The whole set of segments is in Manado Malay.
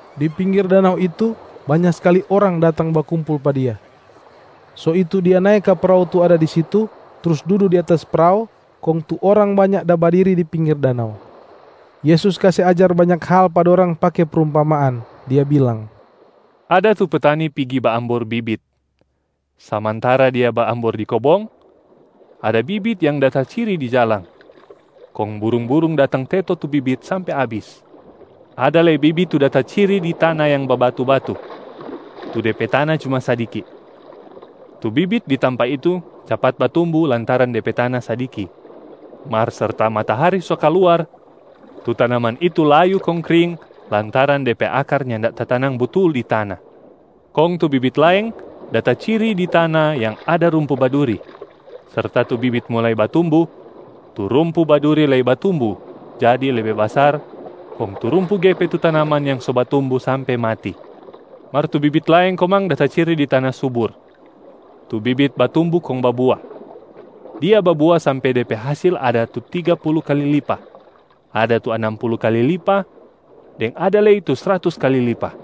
Di pinggir danau itu banya skali orang datang bakumpul pa Dia. So itu Dia nae ka prao tu ada di situ trus dudu di atas prao, kong tu orang banya da badiri di pinggir danau. Yesus kase ajar banya hal pa dorang pake prumpamaan, Dia bilang, “Ada tu petani pigi baambor bibit. Samantara dia baambor di kobong, ada bibit yang da taciri di jalang, kong burung-burung datang teto tu bibit sampe abis. Ada lei bibit tu da taciri di tana yang babatu-batu, tu de pe tana cuma sadiki. Tu bibit di tampa itu capat batumbu lantaran de pe tana sadiki. Mar serta matahari so kaluar, tu tanaman itu layu kong kring lantaran de pe akar nyanda tatanang butul di tana. Kong tu bibit laeng da taciri di tana yang ada rumpu baduri. Serta tu bibit mulai batumbu, tu rumpu baduri lei batumbu jadi lebe basar kong tu rumpu gepe tu tanaman yang so batumbu sampe mati. Mar tu bibit laeng komang da taciri di tana subur. Tu bibit batumbu kong babua. Dia babua sampe de pe hasil ada tu tiga pulu kali lipa, ada tu anam pulu kali lipa, deng ada lei tu sratus kali lipa.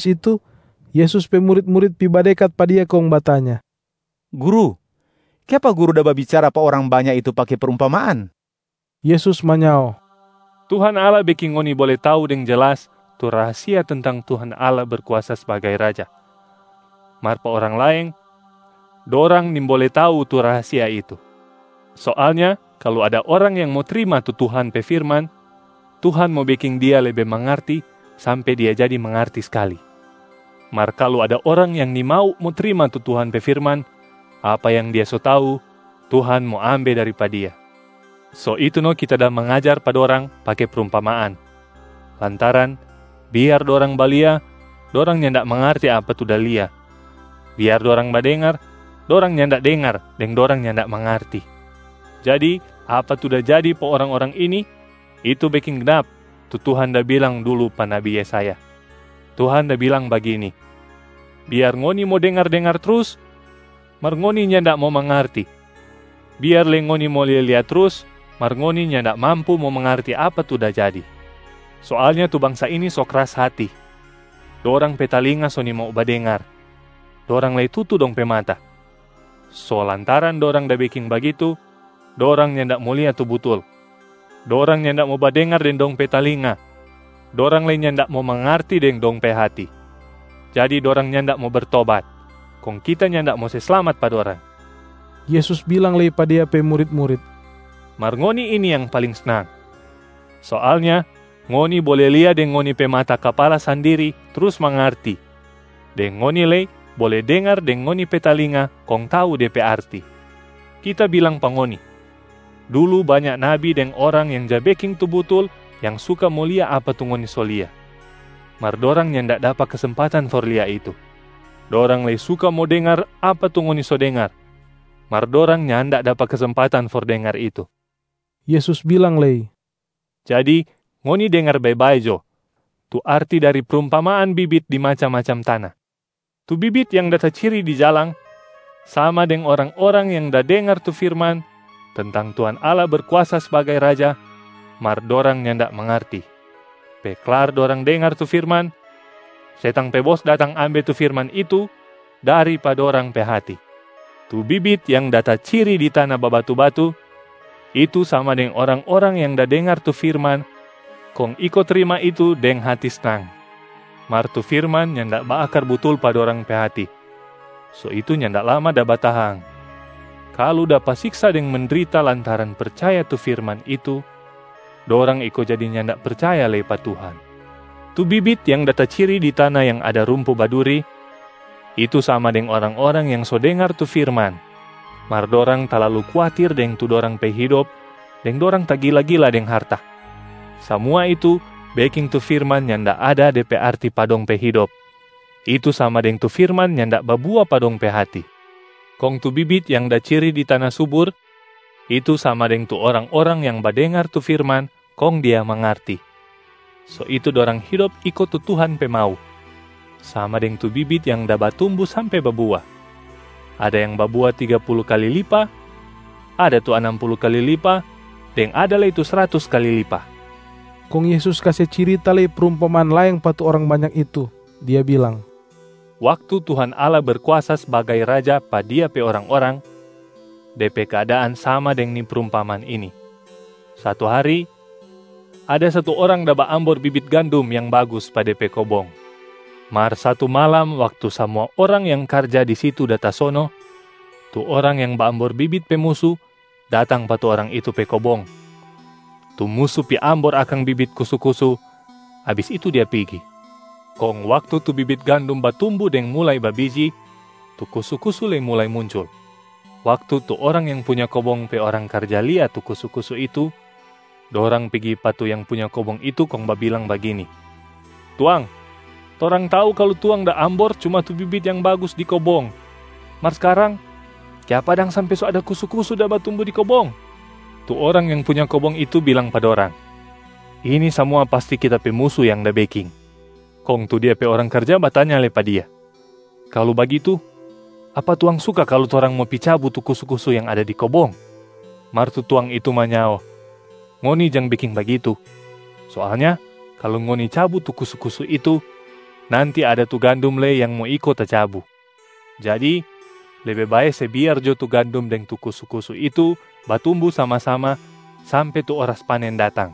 Abis itu, Yesus pe murit-murit pi badekat pa Dia kong batanya, “Guru, kiapa Guru da babicara pa orang banya itu pake prumpamaan?” Yesus manyao, “Tuhan Allah beking ngoni bole tau deng jelas tu rahasia tentang Tuhan Allah Berkuasa sbagai Raja, mar pa orang laeng, dorang nimbole tau tu rahasia itu. Soalnya kalu ada orang yang mo trima tu Tuhan pe firman, Tuhan mo beking dia lebe mangarti sampe dia jadi mangarti skali. Mar kalu ada orang yang nimau mo trima tu Tuhan pe firman, apa yang dia so tau, Tuhan mo ambe dari pa dia. So itu no Kita da mangajar pa dorang pake prumpamaan, lantaran ‘Biar dorang balia, dorang nyanda mangarti apa tu da lia. Biar dorang badengar, dorang nyanda dengar deng dorang nyanda mangarti.’ Jadi apa tu da jadi pa orang-orang ini, itu beking gnap tu Tuhan da bilang dulu pa nabi Yesaya. Tuhan da bilang bagini, ‘Biar ngoni mo dengar-dengar trus, mar ngoni nyanda mo mangarti. Biar lei ngoni mo lia-lia trus, mar ngoni nyanda mampu mo mangarti apa tu da jadi. Soalnya tu bangsa ini so kras hati. Dorang pe talinga so nimau mo badengar, dorang lei tutu dong pe mata. So lantaran dorang da beking bagitu, dorang nyanda mo lia tu butul. Dorang nyanda mo badengar deng dong pe talinga, dorang lei nyanda mo mangarti deng dong pe hati, jadi dorang nyanda mo bertobat, kong Kita nyanda mo se slamat pa dorang.’” Yesus bilang lei pa Dia pe murit-murit, “Mar ngoni ini yang paling snang. Soalnya ngoni bole lia deng ngoni pe mata kapala sandiri trus mangarti, deng ngoni lei bole dengar deng ngoni pe talinga kong tau de pe arti. Kita bilang pa ngoni, dulu banya nabi deng orang yang ja beking tu butul yang suka mo lia apa tu ngoni so lia, mar dorang nyanda dapa kesempatan for lia itu. Dorang lei suka mo dengar apa tu ngoni so dengar, mar dorang nyanda dapa kesempatan for dengar itu.” Yesus bilang lei, “Jadi ngoni dengar bae-bae jo tu arti dari prumpamaan bibit di macam-macam tana. Tu bibit yang da taciri di jalang sama deng orang-orang yang da dengar tu firman tentang Tuhan Allah Berkuasa sbagai Raja, mar dorang nyanda mangarti. Pe klar dorang dengar tu firman, setang pe bos datang ambe tu firman itu dari pa dorang pe hati. Tu bibit yang da taciri di tana babatu-batu, itu sama deng orang-orang yang da dengar tu firman kong iko trima itu deng hati snang. Mar tu firman nyanda baakar butul pa dorang pe hati, so itu nyanda lama da batahang. Kalu dapa siksa deng mendrita lantaran percaya tu firman itu, dorang iko jadi nyanda percaya lei pa Tuhan. Tu bibit yang da taciri di tana yang ada rumpu baduri, itu sama deng orang-orang yang so dengar tu firman, mar dorang talalu kuatir deng tu dorang pe hidop deng dorang tagila-gila deng harta. Samua itu beking tu firman nyanda ada de pe arti pa dong pe hidop, itu sama deng tu firman nyanda babua pa dong pe hati. Kong tu bibit yang da ciri di tana subur, itu sama deng tu orang-orang yang badengar tu firman kong dia mangarti. So itu dorang hidop iko tu Tuhan pe mau, sama deng tu bibit yang da batumbu sampe babua. Ada yang babua tiga pulu kali lipa, ada tu anam pulu kali lipa deng ada lei tu sratus kali lipa.” Kong Yesus kase cirita lei prumpamaan laeng pa tu orang banya itu, Dia bilang, “Waktu Tuhan Allah Berkuasa sbagai Raja pa Dia pe orang-orang, de pe keadaan sama deng ni prumpamaan ini: satu hari, ada satu orang da baambor bibit gandum yang bagus pa de pe kobong. Mar satu malam waktu samua orang yang karja di situ da tasono, tu orang yang baambor bibit pe musu datang pa tu orang itu pe kobong. Tu musu pi ambor akang bibit kusu-kusu, abis itu dia pigi. Kong waktu tu bibit gandum batumbu deng mulai babiji, tu kusu-kusu lei mulai muncul. Waktu tu orang yang punya kobong pe orang karja lia tu kusu-kusu itu, dorang pigi pa tu yang punya kobong itu kong babilang bagini, ‘Tuang, torang tau kalu tuang da ambor cuma tu bibit yang bagus di kobong. Mar skarang, kiapa dang sampe so ada kusu-kusu da batumbu di kobong?’ Tu orang yang punya kobong itu bilang pa dorang, ‘Ini samua pasti kita pe musu yang da beking.’ Kong tu dia pe orang karja batanya lei pa dia, ‘Kalu bagitu, apa tuang suka kalu torang mo pi cabu tu kusu-kusu yang ada di kobong?’ Mar tu tuang itu manyao, ‘Ngoni jang beking bagitu. Soalnya kalu ngoni cabu tu kusu-kusu itu, nanti ada tu gandum lei yang mo iko tacabu. Jadi lebe bae se biar jo tu gandum deng tu kusu-kusu itu batumbu sama-sama sampe tu oras panen datang.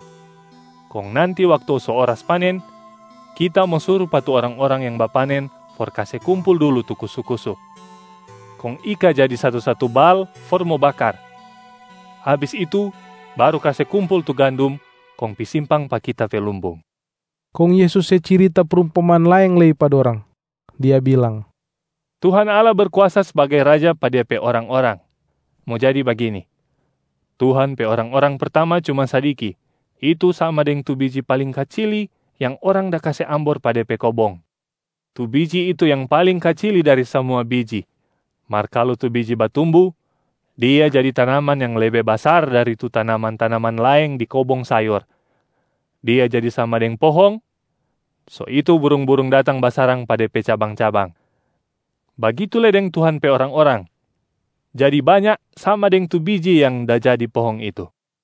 Kong nanti waktu so oras panen, kita mo suru pa tu orang-orang yang bapanen for kase kumpul dulu tu kusu-kusu, kong ika jadi satu-satu bal for mo bakar. Abis itu baru kase kumpul tu gandum kong pi simpang pa kita pe lumbung.’” Kong Yesus se cirita prumpamaan laeng lei pa dorang. Dia bilang, “Tuhan Allah Berkuasa sbagai Raja pa Dia pe orang-orang, mo jadi bagini: Tuhan pe orang-orang pertama cuma sadiki, itu sama deng tu biji paling kacili yang orang da kase ambor pa de pe kobong. Tu biji itu yang paling kacili dari samua biji. Mar kalu tu biji batumbu, dia jadi tanaman yang lebe basar dari tu tanaman-tanaman laeng di kobong sayor, dia jadi sama deng pohong, so itu burung-burung datang basarang pa de pe cabang-cabang, bagitu lei deng Tuhan pe orang-orang jadi banya sama deng tu biji yang da jadi pohong itu.”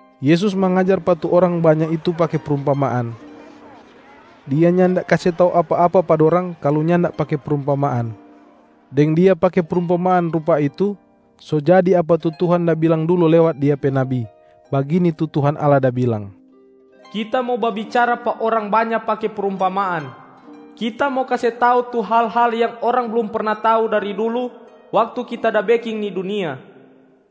Yesus mangajar pa tu orang banya itu pake prumpamaan, Dia nyanda kase tau apa-apa pa dorang kalu nyanda pake prumpamaan. Deng Dia pake prumpamaan rupa itu, so jadi apa tu Tuhan da bilang dulu lewat Dia pe nabi, bagini tu Tuhan Allah da bilang, “Kita mo babicara pa orang banya pake prumpamaan. Kita mo kase tau tu hal-hal yang orang blum perna tau dari dulu waktu Kita da beking ni dunia.”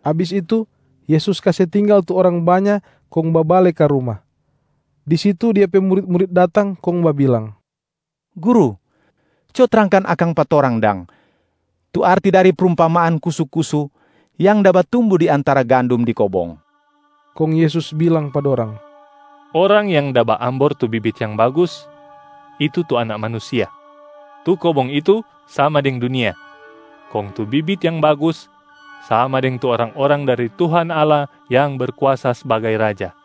Abis itu, Yesus kase tinggal tu orang banya kong babale ka ruma. Di situ Dia pe murit-murit datang kong babilang, “Guru, co trangkan akang pa torang dang tu arti dari prumpamaan kusu-kusu yang da batumbu di antara gandum di kobong.” Kong Yesus bilang pa dorang, “Orang yang da baambor tu bibit yang bagus, itu tu Anak Manusia. Tu kobong itu sama deng dunia, kong tu bibit yang bagus sama deng tu orang-orang dari Tuhan Allah yang Berkuasa sbagai Raja.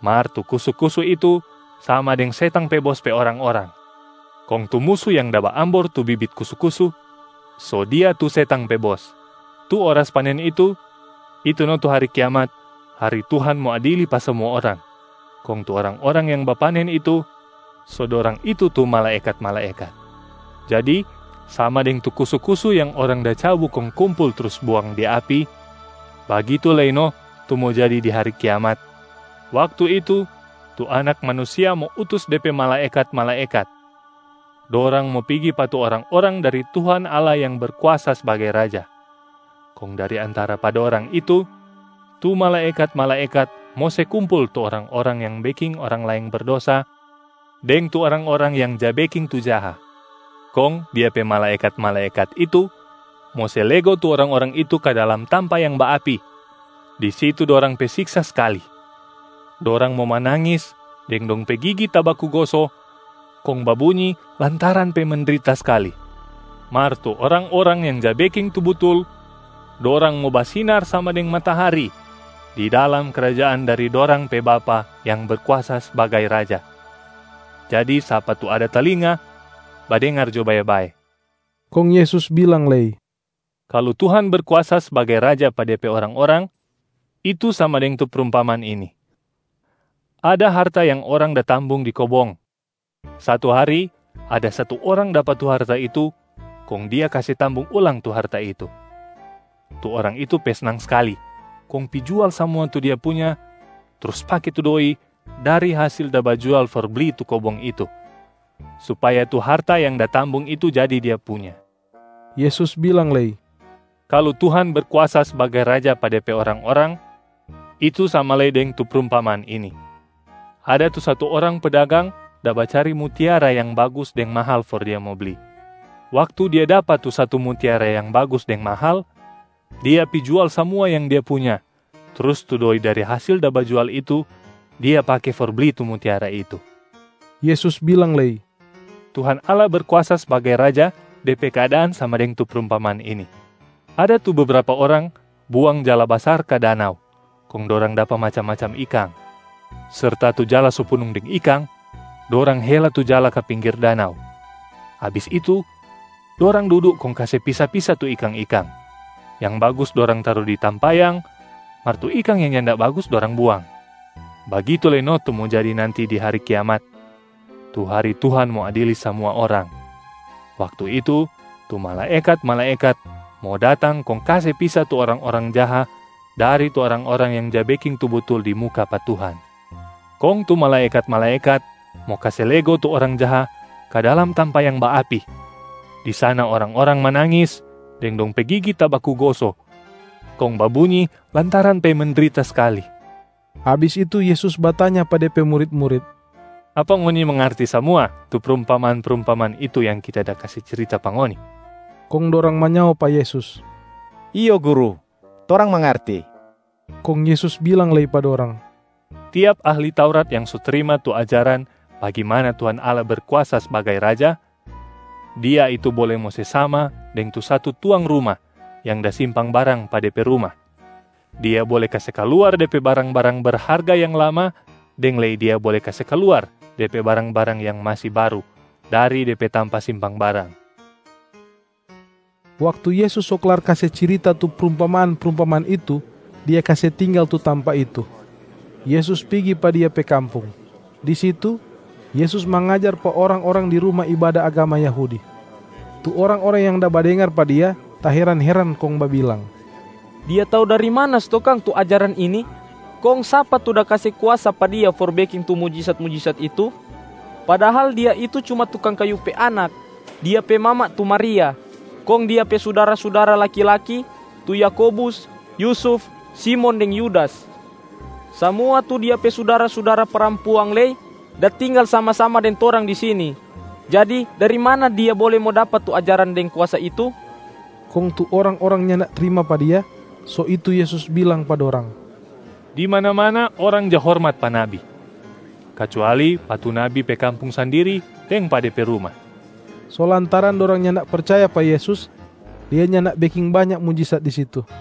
Mar tu kusu-kusu itu sama deng setang pe bos pe orang-orang, kong tu musu yang da baambor tu bibit kusu-kusu, so dia tu setang pe bos. Tu oras panen itu, itu no tu hari kiamat, hari Tuhan mo adili pa samua orang. Kong tu orang-orang yang bapanen itu, so dorang itu tu malaekat-malaekat. Jadi sama deng tu kusu-kusu yang orang da cabu kong kumpul trus buang di api, bagitu lei no tu mo jadi di hari kiamat. Waktu itu, tu Anak Manusia mo utus De pe malaekat-malaekat. Dorang mo pigi pa tu orang-orang dari Tuhan Allah yang Berkuasa sbagai Raja, kong dari antara pa dorang itu, tu malaekat-malaekat mo se kumpul tu orang-orang yang beking orang laeng berdosa deng tu orang-orang yang ja beking tu jaha. Kong Dia pe malaekat-malaekat itu mo se lego tu orang-orang itu ka dalam tampa yang baapi. Di situ dorang pe siksa skali, dorang mo manangis deng dong pe gigi tabaku goso kong babunyi lantaran pe mendrita skali. Mar tu orang-orang yang ja beking tu butul, dorang mo basinar sama deng matahari di dalam krajaan dari dorang pe Bapa yang Berkuasa sbagai Raja. Jadi sapa tu ada talinga, badengar jo bae-bae!” Kong Yesus bilang lei, “Kalu Tuhan Berkuasa sbagai Raja pa Dia pe orang-orang, itu sama deng tu prumpamaan ini: ada harta yang orang da tambung di kobong. Satu hari ada satu orang dapa tu harta itu kong dia kase tambung ulang tu harta itu. Tu orang itu pe snang skali kong pi jual samua tu dia punya trus pake tu doi dari hasil da bajual for bli tu kobong itu, supaya tu harta yang da tambung itu jadi dia punya.” Yesus bilang lei, “Kalu Tuhan Berkuasa sbagai Raja pa Dia pe orang-orang, itu sama lei deng tu prumpamaan ini: ada tu satu orang pedagang da bacari mutiara yang bagus deng mahal for dia mo bli. Waktu dia dapa tu satu mutiara yang bagus deng mahal, dia pi jual samua yang dia punya trus tu doi dari hasil da bajual itu dia pake for bli tu mutiara itu.” Yesus bilang lei, “Tuhan Allah Berkuasa sbagai Raja de pe keadaan sama deng tu prumpamaan ini: ada tu bebrapa orang buang jala basar ka danau kong dorang dapa macam-macam ikang. Serta tu jala so punung deng ikang, dorang hela tu jala ka pinggir danau. Abis itu dorang dudu kong kase pisa-pisa tu ikang-ikang, yang bagus dorang taru di tampayang, mar tu ikang yang nyanda bagus dorang buang. Bagitu lei no tu mo jadi nanti di hari kiamat, tu hari Tuhan mo adili samua orang. Waktu itu, tu malaekat-malaekat mo datang kong kase pisa tu orang-orang jaha dari tu orang-orang yang ja beking tu butul di muka pa Tuhan. Kong tu malaekat-malaekat mo kase lego tu orang jaha ka dalam tampa yang baapi. Di sana orang-orang manangis deng dong pe gigi tabaku goso kong babunyi lantaran pe mendrita skali.” Abis itu Yesus batanya pa De pe murit-murit, “Apa ngoni mangarti samua tu prumpamaan-prumpamaan itu yang Kita da kase cirita pa ngoni?” Kong dorang manyao pa Yesus, “Iyo Guru, torang mangarti.” Kong Yesus bilang lei pa dorang, “Tiap ahli Taurat yang so trima tu ajaran bagimana Tuhan Allah Berkuasa sbagai Raja, dia itu bole mo se sama deng tu satu tuang ruma yang da simpang barang pa dia pe ruma: dia bole kase kaluar de pe barang-barang berharga yang lama deng lei dia bole kase kaluar de pe barang-barang yang masi baru dari de pe tampa simpang barang.”a Waktu Yesus so klar kase cirita tu prumpamaan-prumpamaan itu, Dia kase tinggal tu tampa itu. Yesus pigi pa Dia pe kampung. Di situ Yesus mangajar pa orang-orang di ruma ibada agama Yahudi. Tu orang-orang yang da badengar pa Dia taheran-heran kong babilang, “Dia tau dari mana stou kang tu ajaran ini? Kong sapa tu da kase kuasa pa Dia for beking tu mujisat-mujisat itu? Padahal Dia itu cuma tukang kayu pe anak. Dia pe mama tu Maria kong Dia pe sudara-sudara laki-laki tu Yakobus, Yusuf, Simon deng Yudas. Samua tu Dia pe sudara-sudara parampuang lei da tinggal sama-sama deng torang di sini. Jadi dari mana Dia bole mo dapa tu ajaran deng kuasa itu?” Kong tu orang-orang nyanda trima pa Dia, so itu Yesus bilang pa dorang, “Di mana-mana orang ja hormat pa nabi, kacuali pa tu nabi pe kampung sandiri deng pa de pe ruma.” So lantaran dorang nyanda percaya pa Yesus, Dia nyanda beking banya mujisat di situ.